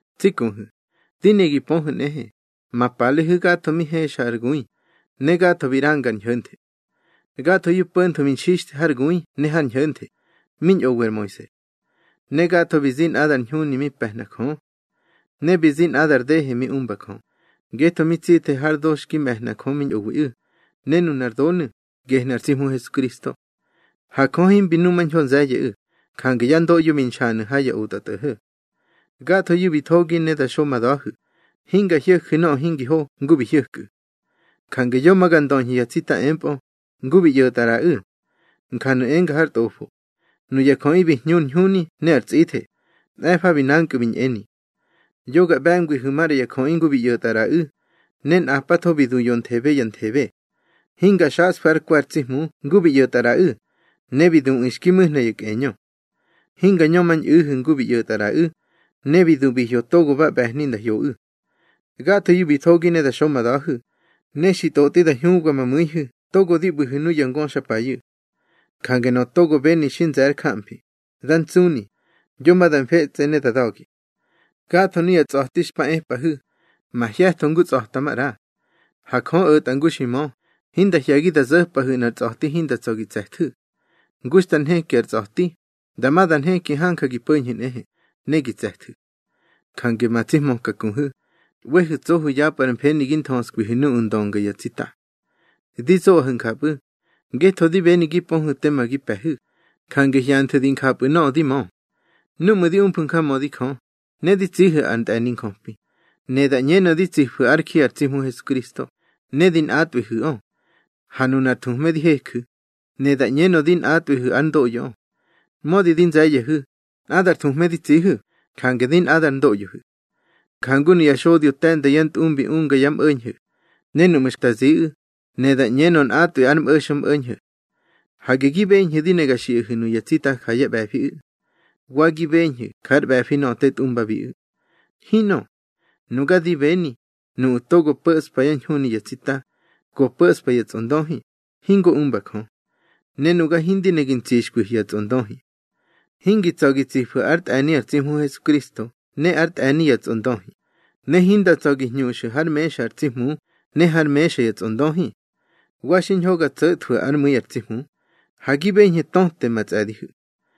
Tsi kuhu̱, di ne gi pöhu̱ nꞌehe, ma palehu̱ gatho mi hexa ar gui, ne gatho bi ꞌranga ar ñho̱nthe. Gathoyu̱ po̱ntho bi nxixthe har gui ne har ñho̱nthe, mi ñꞌowi ar Moise. Ne gatho bi zi nꞌadar ñhuni mi pe̱hna Jö. Ne bi zi nꞌadar dehe mi umba Jö, ngetho mi tsithe har do xki me̱hna Jö mi ñꞌowiꞌu̱, ne nunar donu̱, gehnu̱ ar tsi Hmu Hesukristo. Ha Jö himbi numañho nze̱ye̱ꞌu̱, jange yá ndoꞌyo bi nxanu̱ ha ya otꞌatꞌo̱ho̱. Gathoyu̱ bi thogi ne da xo ma da̱hu̱, hinga hyo̱ju̱ nöꞌö hingi ho ngu bi hyo̱kꞌu̱. Jange yo ma ga ndöñhu̱ ya tsita empꞌö, ngu bi ꞌyo̱tꞌa ꞌraꞌu̱. Njanu̱ enga har Tꞌofo: Nuya jöꞌi bi hñu ar ñhuni ne ar tsꞌithe, mꞌe̱fa bi nankꞌu̱ bi ñꞌeni. Yo ga ꞌbe̱ngwihu̱ maꞌra ya jöꞌi ngu bi ꞌyo̱tꞌa ꞌraꞌu̱, ne nꞌapatho bi du yonthebe ya nthebe. Hinga xaꞌsfu̱ ár kwe̱ ar tsi Hmu ngu bi ꞌyo̱tꞌa ꞌraꞌu̱, ne bi duꞌu̱ xki mu̱hna ya kꞌeñö. Hinga ñömañꞌu̱hu̱ ngu bi ꞌyo̱tꞌa ꞌraꞌu̱, ne bi du bi hyo togo ba ꞌbe̱hni nda hyoꞌu̱. Gathoyu̱ bi thogi ne da xo ma da̱hu̱, ne xi tꞌotꞌi da hñubga ma mu̱ihu̱ togo di ꞌbu̱hu̱ nuya ngöxapayu̱. Jange nöꞌö togo beni xi nze̱ ár jamfi, dá ntsuni, yo ma da mfetsꞌe ne da da̱gi. Gatho nuya tsꞌa̱ti xpa epꞌahu̱, mahye̱tho ngu tsꞌa̱ta maꞌra. Ha Jö o̱tꞌa ngu xi mö, hinda hye̱gi da zo̱pꞌahu̱ nꞌar tsꞌa̱ti hinda tsa̱ gi tse̱thu̱. Ngu xta nheki ar tsꞌa̱ti, dama da nheki hanja gi po̱ñhu̱ nꞌehe, ne gi tse̱thu̱. Jange ma tsi hmöka kuhu̱, ꞌwehu̱ tsohu̱ yapꞌu̱ ar mfeni gi nthöskwihu̱ nuꞌu̱ ndönga ya tsita. Di zoꞌahu̱ njapꞌu̱, ngetho di beni gi pöhu̱ tema gi pe̱hu̱, jange hyanthu̱ di njapꞌu̱ nöꞌö di mö. Núꞌmu̱ di umfu̱ njamödi Jö, ne di tsihu̱ ar ntꞌe̱ni njöpi, ne da ꞌñenö di tsifu̱ ár ji ar tsi Hmu Hesukristo, ne di nꞌatꞌwihu̱ꞌö. Ha nunar thuhme di heju̱, ne da ꞌñenö di nꞌatꞌwihu̱ ár ndoꞌyoꞌö. Mödi di nze̱ye̱hu̱, nꞌadar thuhme di tsihu̱, jange di nꞌadar ndoꞌyohu̱. Jangu nuya xodyo te̱nda yá ntꞌumbi unga yá mꞌo̱ñho̱, ne núꞌmu̱ xta ziꞌu̱, ne da ꞌñenö nꞌatꞌwi ar mꞌo̱xmꞌo̱ñho̱. Hage gi beñhu̱ di ne ga xiꞌahu̱ nuya tsita ja yá ꞌbe̱fiꞌu̱. Wa gi beñhu̱ jár ꞌbe̱fi nöꞌö te tꞌumbabiꞌu̱. Hinꞌö. Nuga di beni, nuꞌu̱ togo po̱ꞌspa ar ñhuni ya tsita, go po̱ꞌspa ya tsꞌondöhi, hingo umba Jö. Ne nuga hindi ne gi ntsixkwihu̱ ya tsꞌondöhi. Hingi tsa̱ gi tsifu̱ ár tꞌe̱ni ar tsi Hmu Hesukristo ne ár tꞌe̱ni ya tsꞌondöhi, ne hinda tsa̱ gi hñuxu̱ hár mexa ar tsi Hmu ne hár mexa ya tsꞌondöhi. Wa xiñho ga tso̱thwu̱ ár mu̱i ar tsi Hmu. Ha gi beñhu̱ töte ma tsꞌe̱dihu̱.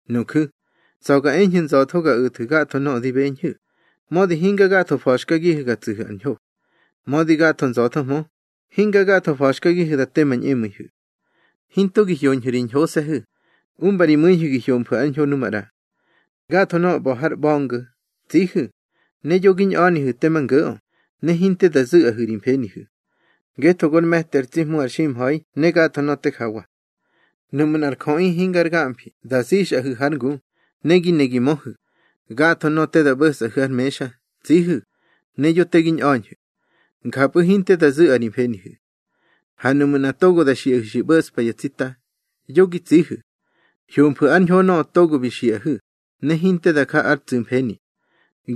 Nuju̱, tsa̱ ga eñhu̱ nza̱tho ga o̱thu̱ gatho nöꞌö di beñhu̱, mödi hinga gatho fa̱xkagihu̱ ga tsu̱hu̱ ar ñho. Mödi gatho nza̱thohmö, hinga gatho fa̱xkagihu̱ da te ma ñꞌemu̱ihu̱. Hinto gi hyoñhu̱ ri ñhose̱hu̱, umba ri mu̱ihu̱ gi hyomfu̱ ár ñho nu maꞌra. Gatho nöꞌö ꞌba̱ har ꞌba̱ngo̱, tsihu̱, ne yo gi ñꞌa̱nihu̱ tema ngo̱ꞌö, ne hinte da zu̱ꞌa ri mfenihu̱. Ngetho gor me̱ti ar tsi Hmu ar ximha̱i ne gatho nöꞌö te jawa. Nuꞌmu̱ nꞌar jöꞌi hingar gamfi da zixꞌahu̱ hár ngu, ne gi ne gi möhu̱, gatho nöꞌö te da ꞌbo̱sꞌahu̱ har mexa, tsihu̱, ne yo te gi ñꞌa̱ñhu̱. Njapꞌu̱ hinte da zu̱ꞌa ri mfenihu̱. Ha nuꞌmu̱ nꞌa togo da xiꞌahu̱ xi ꞌbo̱ꞌspa ya tsita, yo gi tsihu̱. Hyomfu̱ ár ñho nöꞌö togo bi xiꞌahu̱, ne hinte da ja ár tsu̱mfeni.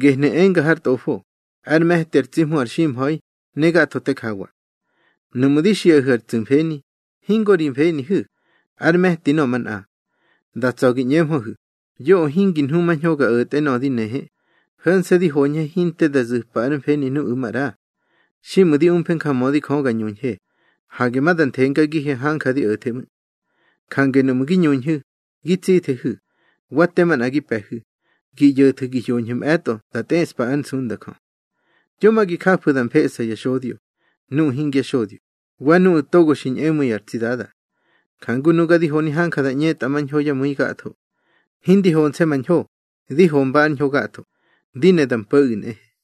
Gehnu̱ enga har Tꞌofo: Ár me̱ti ar tsi Hmu ar ximha̱i ne gatho te jawa. Nuꞌmu̱ di xiꞌahu̱ ar tsu̱mfeni, hingo ri mfenihu̱, ár me̱ti nöꞌö manꞌa. Da tsa̱ gi ꞌñeñhu̱hmö, yoꞌö hingi nhumañho ga o̱the nöꞌö di nehe, ho̱nse̱ di hoñhe hinte da zu̱pa ár mfeni nuꞌu̱ maꞌra. Xiꞌmu̱ di umfe njamödi Jö ga ñuñhe, hage ma da nthengagihe hanja di o̱the ꞌmu̱. Jange nuꞌmu̱ gi ñuñhu̱, gi tsithehu̱, wa te manꞌa gi pe̱hu̱, gi ꞌyo̱thu̱ gi hyoñhu̱ mꞌe̱tꞌo da tꞌeꞌspa ár nsunda Jö. Yo ma gi jafu̱ da mfeꞌsa ya xodyo, nuꞌu̱ hingya xodyo, wa nuꞌu̱ togo xi ñꞌemu̱i ar tsi Dada. Jangu nuga di honi hanja da ꞌñetꞌa mañho yá mu̱i gatho. Hindi honse̱ ma ñho, di homba ár ñho gatho, di ne da mpo̱ꞌu̱ nꞌehe.